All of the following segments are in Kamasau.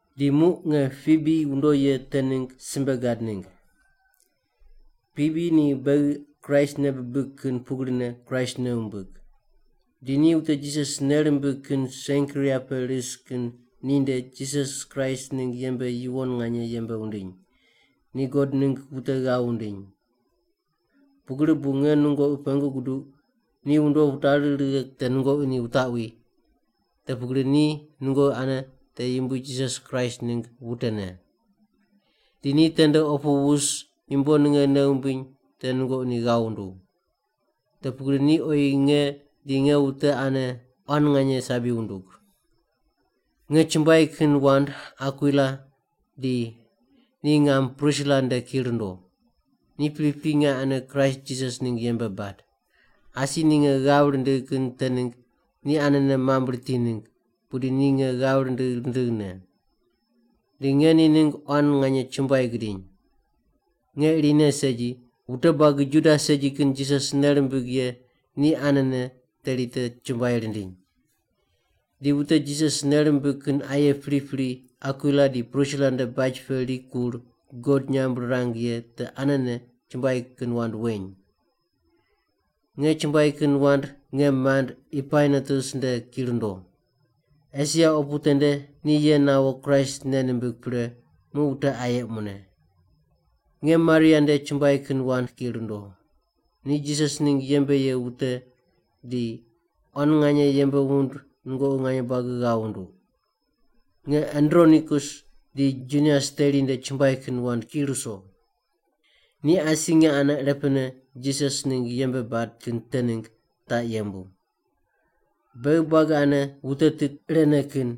Di muq nge Pibi wundo ye te ningg simbe gad ningg. Pibi ni beghi Kraist nei bibig kin pugrine Kraist nei wumbig. Di ni wute Jisas nei rimbig kin Senkria pe ris kin ninde Jisas Kraist ningg yembe yuwon nganye yembe wundiny; ni God ningg wute ghav wundiny. Pugri bu nge nungoqi pengu guduq ni wundo wutari righe te nungoqi ni wutaqwi, te pugri ni nungoqi ane te Yumbui Jisas Kraist ningg wutene. Di ni tende opu wus yumbo ninge nei wumbiny te nungoqi ni ghav wunduw. Te pugri ni oyi nge di nge wute ane quan nganye sabi wundug. Nge chumbuai kin wand Akwila di ni ngam Prisila nde ki rundo. Ni pripri nge ane Kraist Jisas ningg yembe bad. Asi ni nge ghav rindigh kin te ningg ni anene mamb riti ningg, pudi ni nge ghav rindigh rindighne. Di nge ni ningg quan nganye chumbuai gidiny. Nge irine segi, wute buagi Juda segi kin Jisas nei rimbig ye ni anene teri te chumbuai rindiny. Di wute Jisas nei rimbig kin aye pripri Akwila di Prisila nde baj pe rikur God nyamb rirang ye te anene chumbuai kin wand weny. Nge chumbuai kin wand nge mand Epainetus nde ki rundo. Esia opu tende ni ye nawo Kraist nei nimbig pre muq wute aye mune. Nge Maria nde chumbuai kin wand ki rundo. Ni Jisas ningg yembe ye wute di quan nganye yembe wund nungoqi nganye buagi ghav wunduq. Nge Andronikus di Junias teri nde chumbuai kin wand ki ruso. Ni asi nge ane irepene Jisas Kraist ningg yembe bad kin te ningg taq yembu. Beghi buagi ane wute tit irene kin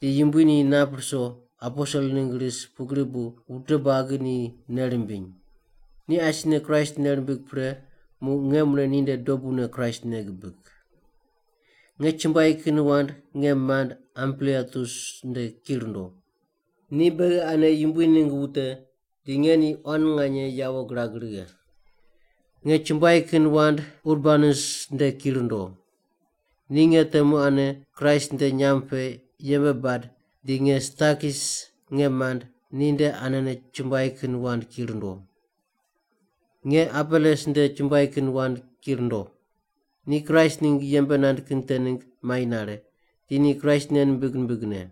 di Yumbui ni nap ruso aposel ningg ris pugri bu wute nganye buagi ni nei rimbiny. Ni asine Kraist nei rimbig pre muq nge mune ninde dobune Kraist nei gibig. Nge chumbuai kin wand nge mand, Ampliatus nde ki rundo. Ni beghi ane Yumbui ningg wute di nge ni quan nganye yawo girag righe. Nge chumbuai kin wand Urbanus nde ki rundo. Ni nge temu ane Kraist nde nyamb pe yembe bad di nge Stakis nge mand ni nde anene chumbuai kin wand ki rundo. Nge Apeles nde chumbuai kin wand ki rundo. Ni Kraist ningg yembe nand kin te ningg mai nare, di ni Kraist nei nimbig nimbigne.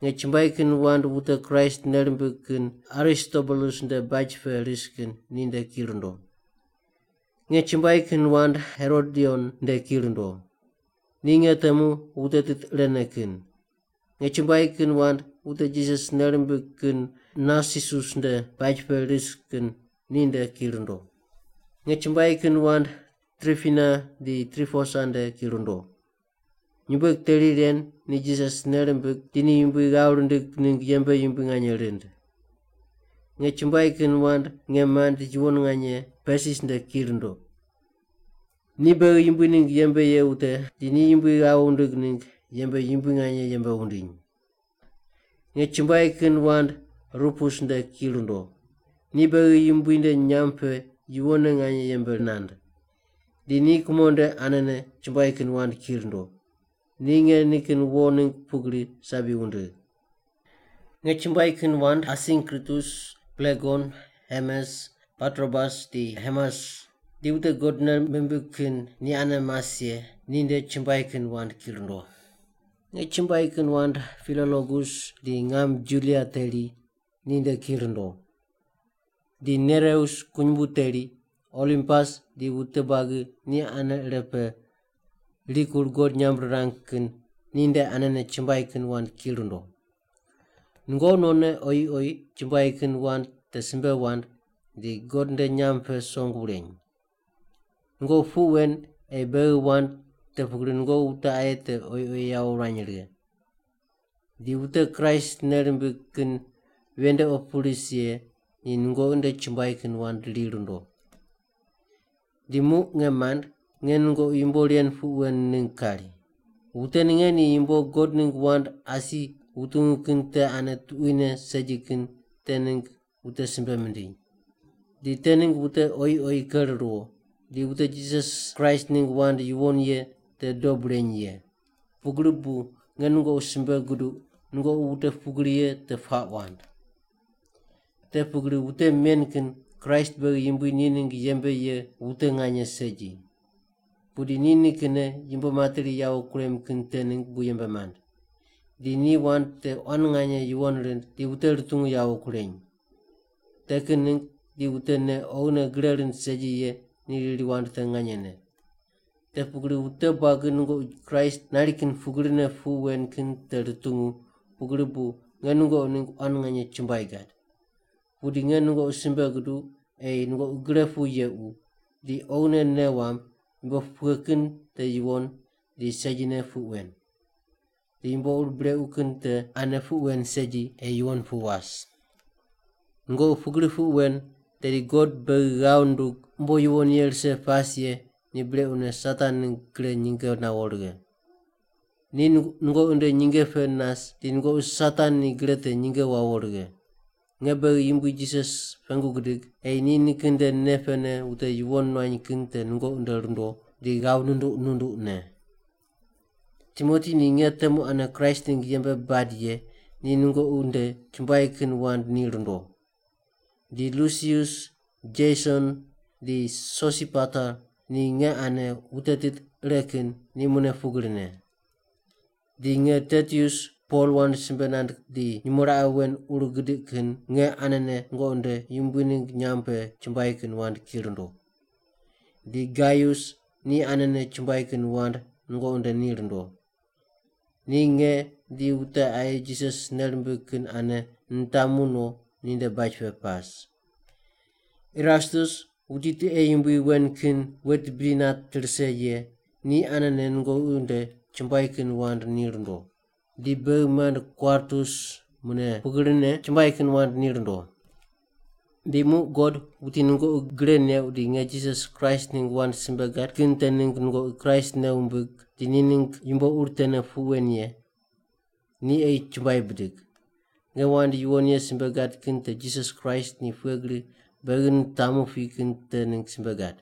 Nge chumbuai kin wand wute Kraist nei rimbig kin Aristobulus nde baj pe ris kin ninde ki rundo. Nge chumbuai kin wand Herodion nde ki rundo. Ni nge temu wute tit irene kin. Nge chumbuai kin wand wute Jisas nei rimbig kin Narsisus nde baj pe ris kin ni nde ki rundo. Nge chumbuai kin wand Tripina di Triposa nde ki rundo. Nyumbueg teri ren ni Jisas nei rimbig di ni Yumbui ghav rindig ningg yembe yumbui nganye rind. Nge chumbuai kin wand nge mand yuwon nganye Persis nde ki rundo. Ni beghi Yumbui ningg yembe ye wute di ni Yumbui ghav wundig ningg yembe yumbui nganye yembe wundiny. Nge chumbuai kin wand Rupus nde ki rundo. Ni beghi Yumbui nde nyamb pe yuwonne nganye yembe nand. Di ni kumo nde anene chumbuai kin wand ki rundo. Ni nge nikin wo ningg pugri sabi wundigh. Nge chumbuai kin wand Asinkritus, Plegon, Hermes, Patrobas, di Hermas di wute God nei mimbig kin ni ane mas ye ni nde chumbuai kin wand ki rundo. Nge chumbuai kin wand Pilologus di ngam Julia teri ni nde ki rundo. Di Nereus kunyumbu teri, Olimpas di wute buagi ni ane ire pe rikur God nyamb rirang kin ninde anene chumbuai kin wand ki rundo. Nungoqi nonne oyi oyi chumbuai kin wand te simbe wand di God nde nyamb pe song wureny. Nungoqi puq wen ei bei wand, te pugri nungoqi wute aye te oyi oyi yawo wurany righe. Di wute Kraist nei rimbig kin ven nde opu ris ye ni nungoqi nde chumbuai kin wand ri rundo. Di muq nge mand, nge nungoqi yumbo ren puq wen ningg kari. Wute ninge ni yumbo God ningg wand asi wutungu kin te ane tuquine segi kin te ningg wute simbe mindiny. Di te ningg wute oyi oyi ker ruwo, di wute Jisas Kraist ningg wand yuwon ye te dob reny ye. Pugri bu nge nungoqi simbe guduq nungoqi wute pugri ye te puaq wand. Te pugri wute men kin Kraist beghi Yumbui ni ningg yembe ye wute nganye segi. Pudi ni nikinne yumbo materi yawo kurem kin te ningg bu yembe mand. Di ni wand te quan nganye yuwon rind di wute rutungu yawo kureny. Te kin ningg di wute nei oghine gre rind segi ye ni riri wand te nganyene. Te pugri wute buagi nungoqi Kraist nari kin pugrine puq wen kin te rutungu, pugri bu nge nungoqi ningg quan nganye chumbuai gad. Pudi nge nungoqi simbe guduq ei nungoqi gre pu yequ, di oghine nei wamb, yumbo pughe kin te yuwon di segine puq wen. Di yumbo ur brequ kin te ane puq wen segi ei yuwon pu was. Nungoqi pugri puq wen tedi God beghi ghav nundug umbo yuwon ye rise pas ye ni brequne Satan ningg gre nyinge nawo righe. Ni nungoqi nde nyinge pe nas di nungoqi Satan ni gre te nyinge wawo righe. Nge beghi Yumbui Jisas pengu gidig ei ni nikin nde nei pene wute yuwon nuany kin te nungoqi nde rundo di ghav nunduq nunduqne. Timoti ni nge temu ane Kraist ningg yembe bad ye ni nungoqi nde chumbuai kin wand ni rundo. Di Lusius, Jeson di Sosipater ni nge ane wute tit ire kin ni mune pugrine. Di nge Tertius, Pol wand simbe nand di nyumo raqe wen ur gidiq kin, nge anene nungoqi nde Yumbui ningg nyamb pe chumbuai kin wand ki rundo. Di Gaius, ni anene chumbuai kin wand nungoqi nde ni rundo. Ni nge di wute aye Jisas nei rimbig kin ane nitamu no ninde baj pe pas. Erastus wuti tiqe yumbui wen kin wet bidi nat rise ye ni anene nungoqi nde chumbuai kin wand ni rundo. Di beghi mand Kwartus mune pugrine chumbuai kin wand ni rundo. Di muq God, wuti nungoqi gre neuq di nge Jisas Kraist ningg wand simbe gad kin te ningg nungoqi Kraist nei wumbig di ni ningg yumbo ur tene puq wen ye, ni ei chumbuai bidig. Nge wand yuwon ye simbe gad kin te Jisas Kraist ni pughe gri beghi nitamu pi kin te ningg simbe gad.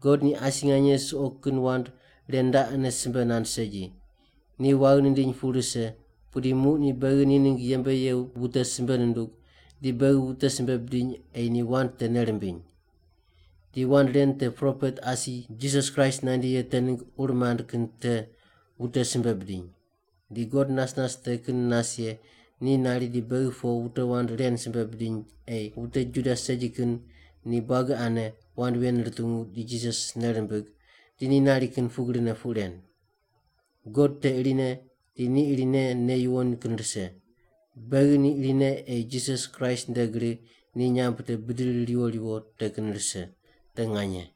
God ni asi nganye suqo kin wand ren raqene simbe nand segi. Ni waghi nindiny pu rise, pudi muq ni beghi ni ningg yembe ye wute simbe nundug di beghi wute simbe bidiny ei ni wand te nei rimbiny. Di wand ren te propet asi Jisas Kraist nandi ye te ningg ur mand kin te wute simbe bidiny. Di God nas nas te kin nas ye ni nari di beghi po wute wand ren simbe bidiny ei wute Juda segi kin ni buagi ane wand ven rutungu di Jisas nei rimbig di ni nari kin pugrine puq ren. God te irine di ni irine nei yuwon kin rise. Beghi ni irine ei Jisas Kraist nde gri ni nyamb te bidiri riwo riwo te kin rise. Te nganye.